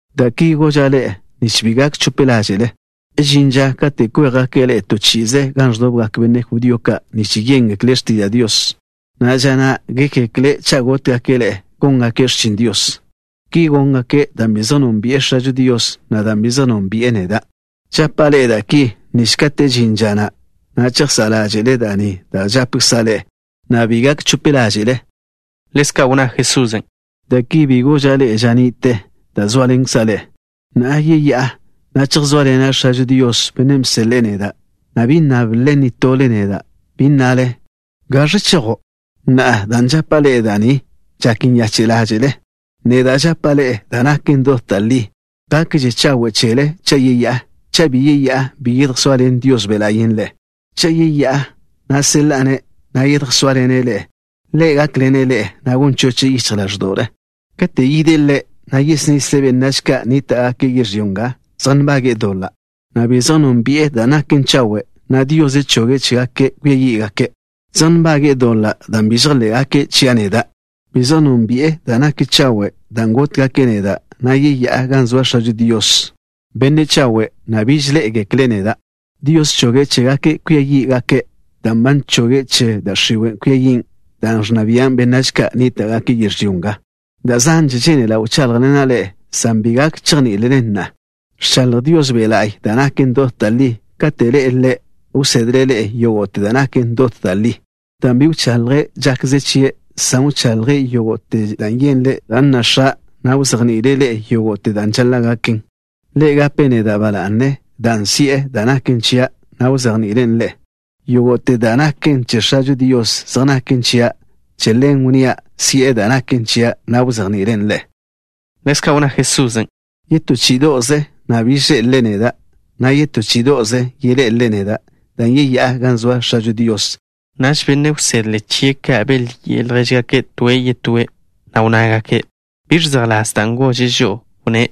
’Da' ki goža' ḻe'e, nich bi gak chope ḻáže'le. Žin ža kate' kwéjgake' ḻe'e to chi'ize gan ẕdobgak benne' judío ka' nich yéngekle' x̱tiža' Dios, na' ža na' gékgekle' cha' gótgake' ḻe'e góngake' x̱chin Dios. Ki góngake' dan' bi zej nónbi'e X̱ažo Dios, na' dan' bi zej nónbi'e neda'. Žapa' ḻe'e da' ki, nich kate' žin ža na', chejsá' ḻáže'le da' ni da' žapkza' ḻe'e, na' bi gak chope ḻáže'le. Ḻezka' wnná Jesusen': —Da' ki bi goža' ḻe'e ža ni'te, dan' zóaḻenkza' ḻe'e. Na'a yeyá'a, na' chejsóaḻena' X̱ažo Dios, Bennen' bseḻe'e neda', na' bi nnáblele nitole ḻe'e neda', bi nnale: “¿Gaẕ chejo'?” Na'a, dan' žapa' ḻe'e da' ni, žak nyache' ḻáže'le. Neda' žapa' ḻe'e da' naken dot da' li. Gakže chawe' chele cha' yeyá'a. Cha' bi yeyá'a, bi yedjsóaḻen Dios Be' La'y ḻe'e. Cha' yeyá'a, na' seḻa'a-ne', na' yedjsóaḻene' ḻe'e. Ḻe' gákḻene' ḻe'e, na' gon choche' yichj ḻáẕdo'le. Kate' yide' Ḻe', yesnisle' benách ka' nníta'gake' yežlyó nga zej nbage'e doḻa', na' bi zej nónbi'e da' naken chawe', na' Dios choge' chégake' kwia yí'gake'. Zej nbage'e doḻa' dan' bi žejḻé'gake' chia' neda'. Bi zej nónbi'e da' naken chawe' dan' gótgake' neda', na' yeyá'a gan zoa X̱ažo Dios, Benne' chawe', na' biž ḻé'egekle' neda'. Dios choge' chégake' kwia yí'gake' dan' ba bchoge' che da' x̱iwe' kwia yin', dan' ẕnna bian' benách ka' nníta'gake' yežlyó nga. ’Da' zanže žénela' wcháḻjḻena' ḻe'e, san bi gak chejní'ilelen na'a. Ẕchaḻj Dios Be' La'y da' naken dot da' li. Kate' ḻe'e Ḻe', wsedle' ḻe'e yógo'te da' naken dot da' li, dan' bi wchaḻje' žakze chie', san wchaḻje' yógo'te da' yenle' dan' nna X̱a', na' wzejni'ile' ḻe'e yógo'te da' žaḻa' gaken. Ḻe' gape' neda' ba la'ne, dan' si'e da' naken chia', na' wzejni'ilen' ḻe'e. Yógo'te da' naken che X̱ažo Dios zej naken chia'. Che ḻen wnnía' si'e da' naken chia', na' wzejni'ilen' ḻe'e. Ḻezka' wnná Jesusen': —Yetó chí'ido'ze, biž ḻé'elele neda', na' yetó chí'ido'ze yeḻé'elele neda', dan' yeyá'a gan zoa X̱ažo Dios. Naž benne' wsedle chie' ka' belyi'e ljéžgake' toe' yetóe', na' wnnágake': —¿Biẕ zejḻás dan' gože' žo'o? Wnné':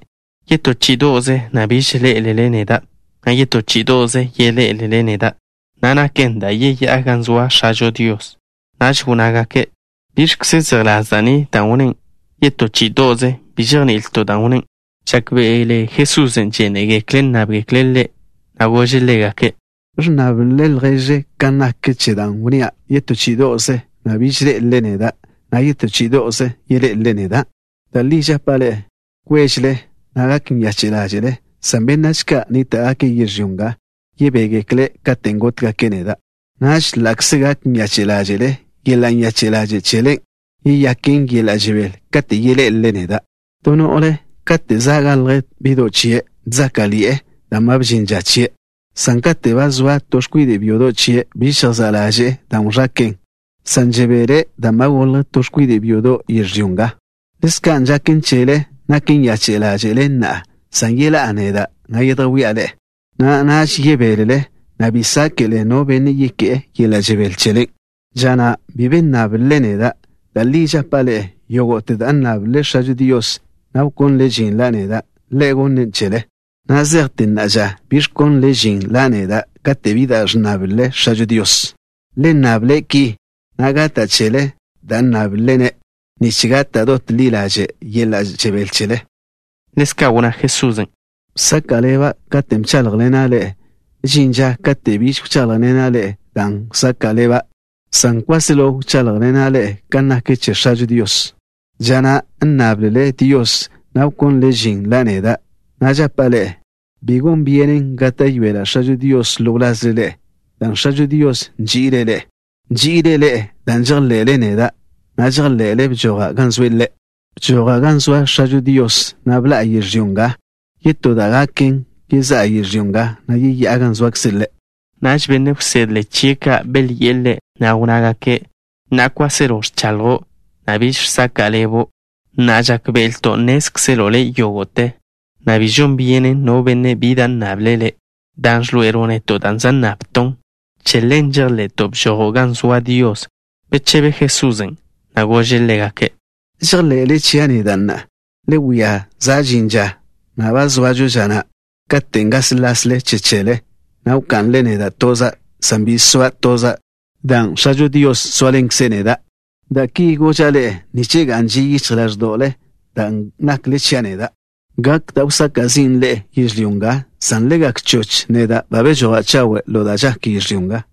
“Yetó chí'ido'ze, na' biž ḻé'elele neda', na' yetó chí'ido'ze yeḻé'elele neda', na' naken dan' yeyá'a gan zoa X̱ažo Dios.” Naž wnnágake': —¿Biẕkze zejḻás da' ni, dan' wnné': “Yetó chí'ido'ze”? Bi žejni'ilto' dan' wnné'. Žákbe'ele Jesusen' žénegekle' nnábgekle' Ḻe', na' gože' ḻégake': —¿Ẕnnáblele lježle kan nak che dan' wnnía': yetó chí'ido'ze, na' biž ḻé'elele neda', na' yetó chí'ido'ze yeḻé'elele neda'? Da' li žapa' ḻe'e: kwéžele, na' gak nyache' ḻáže'le, san benách ka' nníta'gake' yežlyó nga yebégekle' katen' gótgake' neda'. Naž ḻa'kze gak nyache' ḻáže'le, yeḻa' nyache' ḻaže' chelen' yeyaken yeḻa' žebél katen' yeḻé'elele neda'. To no'le kate' za' galj bi'do' chie', ẕzáka'ḻi'e, dan' ba bžin ža chie', san kate' ba zoa to x̱kwide' byodo' chie', biž žejsá' ḻaže'e dan' wẕake'e, san žebele' dan' ba golj to x̱kwide' byodo' yežlyó nga. Ḻezka' žaken chele. Nak nyache' ḻáže'le na'a, san yeḻá'a neda', na' yedjwía' ḻe'e, na' naž yebélele, na' bi sáke'le no benne' yeké'e yeḻa' žebél chelen'. ’Ža na' bi be nnáblele neda'. Da' li žapa' ḻe'e: yógo'te da' nnáblele X̱ažo Dios, na' wkónlele žin la' neda', Ḻe' gonnen' chele. Na' zejte na'a ža bi ẕkónlele žin la' neda' kate' bi da' ẕnnáblele X̱ažo Dios. Le nnable' ki, na' gata' chele da' nnáblele-ne', nich gak dot ḻi ḻaže' yeḻa' žebél chele. Ḻezka' wnná Jesusen': —Bsaka' ḻeba' katen' bcháḻjḻena' ḻe'e. Žin ža kate' biž wcháḻjḻena' ḻe'e da' wsaka' ḻeba', san kwáselo wcháḻjḻena' ḻe'e kan nak che X̱ažo Dios. Ža na' nnáblele Dios, na' wkónlele žin la' neda', na' žapa' ḻe'e, bi gon byenen gáta'yoela' X̱ažo Dios ḻo wlazle ḻe'e, dan' X̱ažo Dios nži'ile' ḻe'e. Nži'ile' ḻe'e dan' nží'ilele neda', na' žejḻe'le bžoja' gan zoe' Ḻe'. Bžoja' gan zoa X̱ažo Dios, na' bḻa'a yežlyó nga. Yetó da' gaken, yezá'a yežlyó nga, na' yeyá'a gan zoakze' Ḻe'. Naž benne' wsedle chie' ka' belyi'e Ḻe', na' wnnágake': —Na'a kwáselo ẕchaḻjo', na' biž žsaka' ḻebo'. Na'a žákbe'elto' nnézkzelo' Le' yógo'te, na' bi žon byenen no benne' bi da' nnable' Le', dan' ẕḻoe'elo' neto' da' za' nnabton'. Che ḻen žejḻe'to' bžojo' gan zoa Dios. Bechebe Jesusen', na' gože' ḻégake': —¿Žejḻe'le chia' neda' na'a? Le wia, za' žin ža, na' ba zoažo ža na', katen' gáslasle che chele, na' wka'nle neda' toza', san bi soa' toza', dan' X̱ažo Dios zóaḻenkze' neda'. Da' ki goža' ḻe'e nich ga'n ži yichj ḻáẕdo'le, dan' nakle chia' neda'. Gak da' wsaka' zin' ḻe'e yežlyó nga, san le gak choch. Neda' ba bežoja' chawe' ḻo da' žak yežlyó nga.